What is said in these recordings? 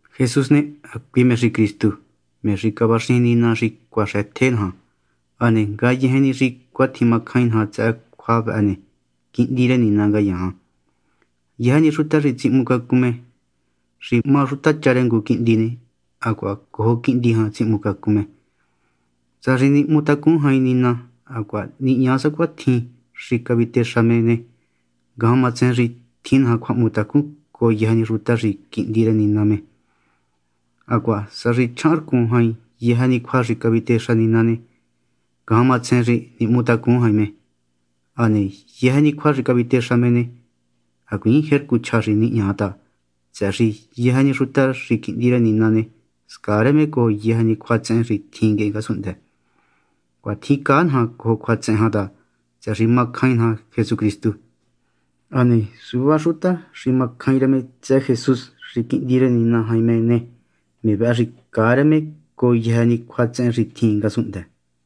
Jesús ne, hacui me xi Cristu, me xi cavaxijin Nina xi cuaxëtje naja. Hane ngayejen ni xi cuatjin macjain naja tsëhë cjua vëhë ne, quihndi rë Nina ngayaan. Yëjë ni xuta xi tsihmucacun me xi má xutacha rë ngu quihndi ne, hacuaha cojo quihndi jan tsihmucacun me. Sa xi nihmutacun jain Nina hacuaha nihña sacuatjin xi cavitexa me ne, ngajan matsejen xi tjin naja cjuahmutacun cojo yëjë ni xuta xi quihndi rë Nina me. Hacuaha sa xi chjahanrcun jain yëjë ni cjua xi cavitexa Nina ne, ngajan matsejen xi nihmutacun jain me. Hane yëjë ni cjua xi cavitexa me ne, hacuiin jercu chja xi nihña ta, tsëhë xi yëjë ni xuta xi quihndi rë Nina ne, scaa rë me cojo yëjë ni cjuatsehen xi tjin nguehe ngasunhndë. Cuatjin caa naja cojo cjuatsehen jan ta, tsëhë xi macjain naja Jesucristu. Hane suvá ni xuta xi macjain rë tsëhë Jesús xi Quihndi rë Nina jain me ne, me vëhë xi caa rë me cojo yëjë ni cjuatsehen xi tjin ngasunhndë.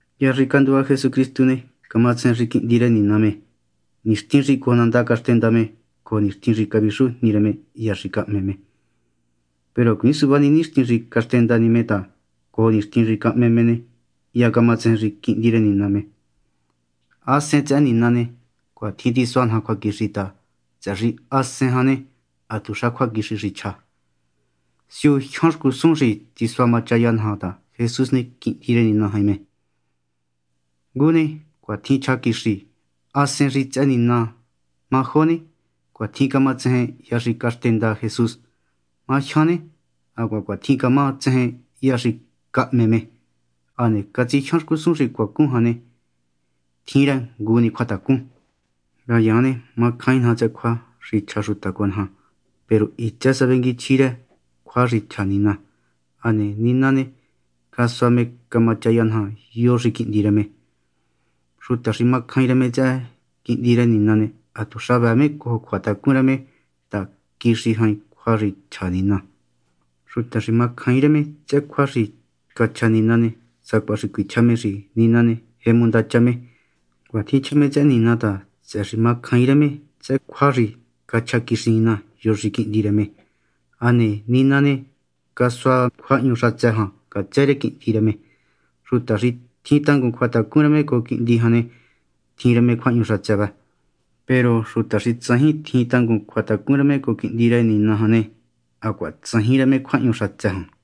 Hya xi canduva Jesucristu ne, camatsejen xi Quihndi rë Nina me nixtin xi cojo nandá caxtenda me cojo nixtin xi cavixu jni rë me hya xi cahme me. Peru hacuiin suvá ni nixtin xi caxtenda ni me ta cojo nixtin xi cahme me ne, hya camatsejen xi Quihndi rë Nina me. Hasen xi tsëhë Nina ne, cuatjin tisua naja cjuaquixi ta, tsëhë xi Hasen jan ne, hatuxa cjuaquixi xi chja. Siu jyan xcusun xi tisua machaya naja ta Jesús ne, Quihndi rë Nina jain me. Ngu ne, cuatjin chja quixi Hasen xi tsëhë Nina. Ma jo ne, cuatjin camatsejen hya xi caxtenda Jesús. Ma jyan ne, hacuaha cuatjin cama tsejen hya xi cahme me. Hane catsijyan xcusun xi cuacun jan ne, tjin rë ngu ni cjuatacun. Ngayaan ne, macjain naja tsëhë cjua xi chja xuta cojo naja. Peru hitsë sa vengui chjí rë cjua xi chja Nina. Hane Nina ne, casua me camachaya naja yo xi Quihndi rë me. Xuta xi macjain rë me tsëhë Quihndi rë Nina ne, hatuxa vëë me cojo cjuatacun rë me ta quixi jain cjua xi cachja Nina. Xuta xi macjaain rë me tsëhë cjua xi cachja Nina ne, sacuaha xi cuichja me xi Nina ne, jemu ndacha me. Cuatjin chja me tsëhë Nina ta, tsëhë xi macjaain rë me tsëhë cjua xi cachja quixi Nina, yo xi Quihndi rë me. Hane Nina ne, cachja cjuahñu xatsë jan ngatsë rë Quihndi rë me. Xuta xi tjin tangun cjuatacun rë me cojo Quihndi jan ne, tjin rë me cjuahñu xatsë vëhë. Peru xuta xi tsajin tjin tangun cjuatacun rë me cojo Quihndi rë Nina jan ne, hacuaha tsajin rë me cjuahñu xatsë jan.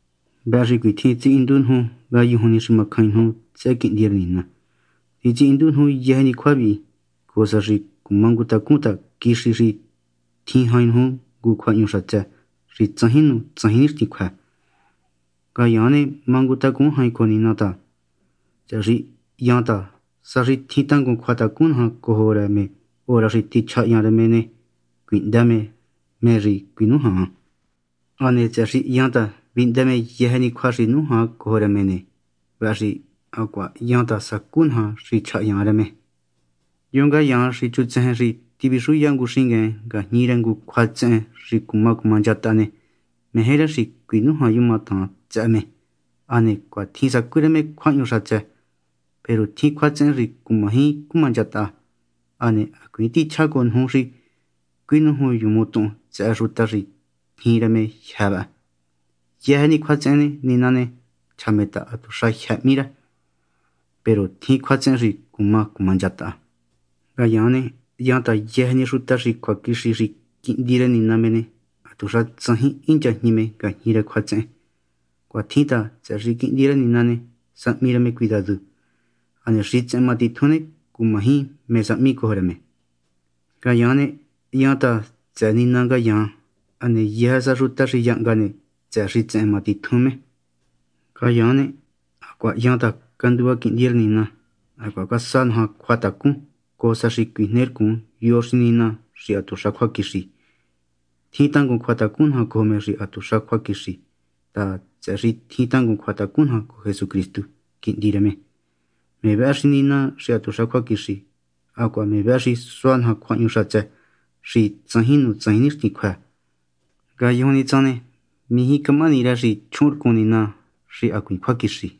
Vëhë xi cuitjin titsihindu nuju ngayujun ni xi macjain nuju tsëhë Quihndi rë Nina. Titsihindu nuju yëjë ni cjua vihi, cojo sa xi cumangutacun ta quixi xi tjin jain nuju ngu cjuahñu xatsë xi tsajin nu tsajin nixtin xi cjuë. Ngayaan ne, mangutacun jain cojo Nina ta, tsëhë xi ha hyan ta sa xi tjin tangun cjuatacun naja cojo rë me hora xi tichjahyan rë me ne, cuihndë me xi cuinújan. Hane tsëhë xi hyan ta vihndë me yëjë ni cjua xi nújan cojo rë me ne, vëhë xi hacuaha hyan ta sacú naja xi cachjahyan rë me. Yo ngayaan xi chutsejen xi tivixuya ngu xingueen ngajñi rë ngu cjuatsehen xi cuma cumanchataha ne, meje rë xi cuinújanyumatahan tsëhë me, hane cuatjin sacú rë me cjuahñu xatsë. Peru tjin cjuatsehen xi cumaji cumanchataha. Hane hacuiin tichjá cojo nuju xi cuinújunyumuntuhun tsëhë xuta xi tjin rë me jyë́ vëhë. Yëjë ni cjuatsehen ne, Nina ne, chja me ta hatuxa jyë́ hmí rë. Peru tjin cjuatsehen xi cuma cumanchataha. Ngayaan ne, hyan ta yëjë ni xuta xi cjuaquixi xi quihndi rë Nina me ne, hatuxa tsajin hinchajñi me ngajñi rë cjuatsehen. Cuatjin ta, tsëhë xi Quihndi rë Nina ne, sahmi rë me cuidadu, hane xitsehen matitjun ne, cumaji mé sahmi cojo rë me. Ngayaan ne, ha hyan ta tsëhë Nina ngayaan. Hane yëjë sa xuta xi yahnga ne, tsëhë xitsehen má titjun me. Ngayaan ne, hacuaha hyan ta ha canduva Quihndi rë Nina. Hacuaha casua naja me cjuatacun, cojo sa xi cuijnercun yo xi Nina xi hatuxa cjuaquixi. Tjin tangun cjuatacun naja cojo me xi hatuxa cjuaquixi ta, tsëhë xi tjin tangun cjuatacun naja cojo Jesucristu, Quihndi rë me. Me vëhë xi Nina xi hatuxa cjuaquixi, hacuaha me vëhë xi sua naja cjuahñu xatsë xi tsajin nu tsajin nixtin xi cjuë. Ngayujun ni tsan ne, mijí camahani rë xi chjuhunrcun nina xi hacuiin cjuaquixi.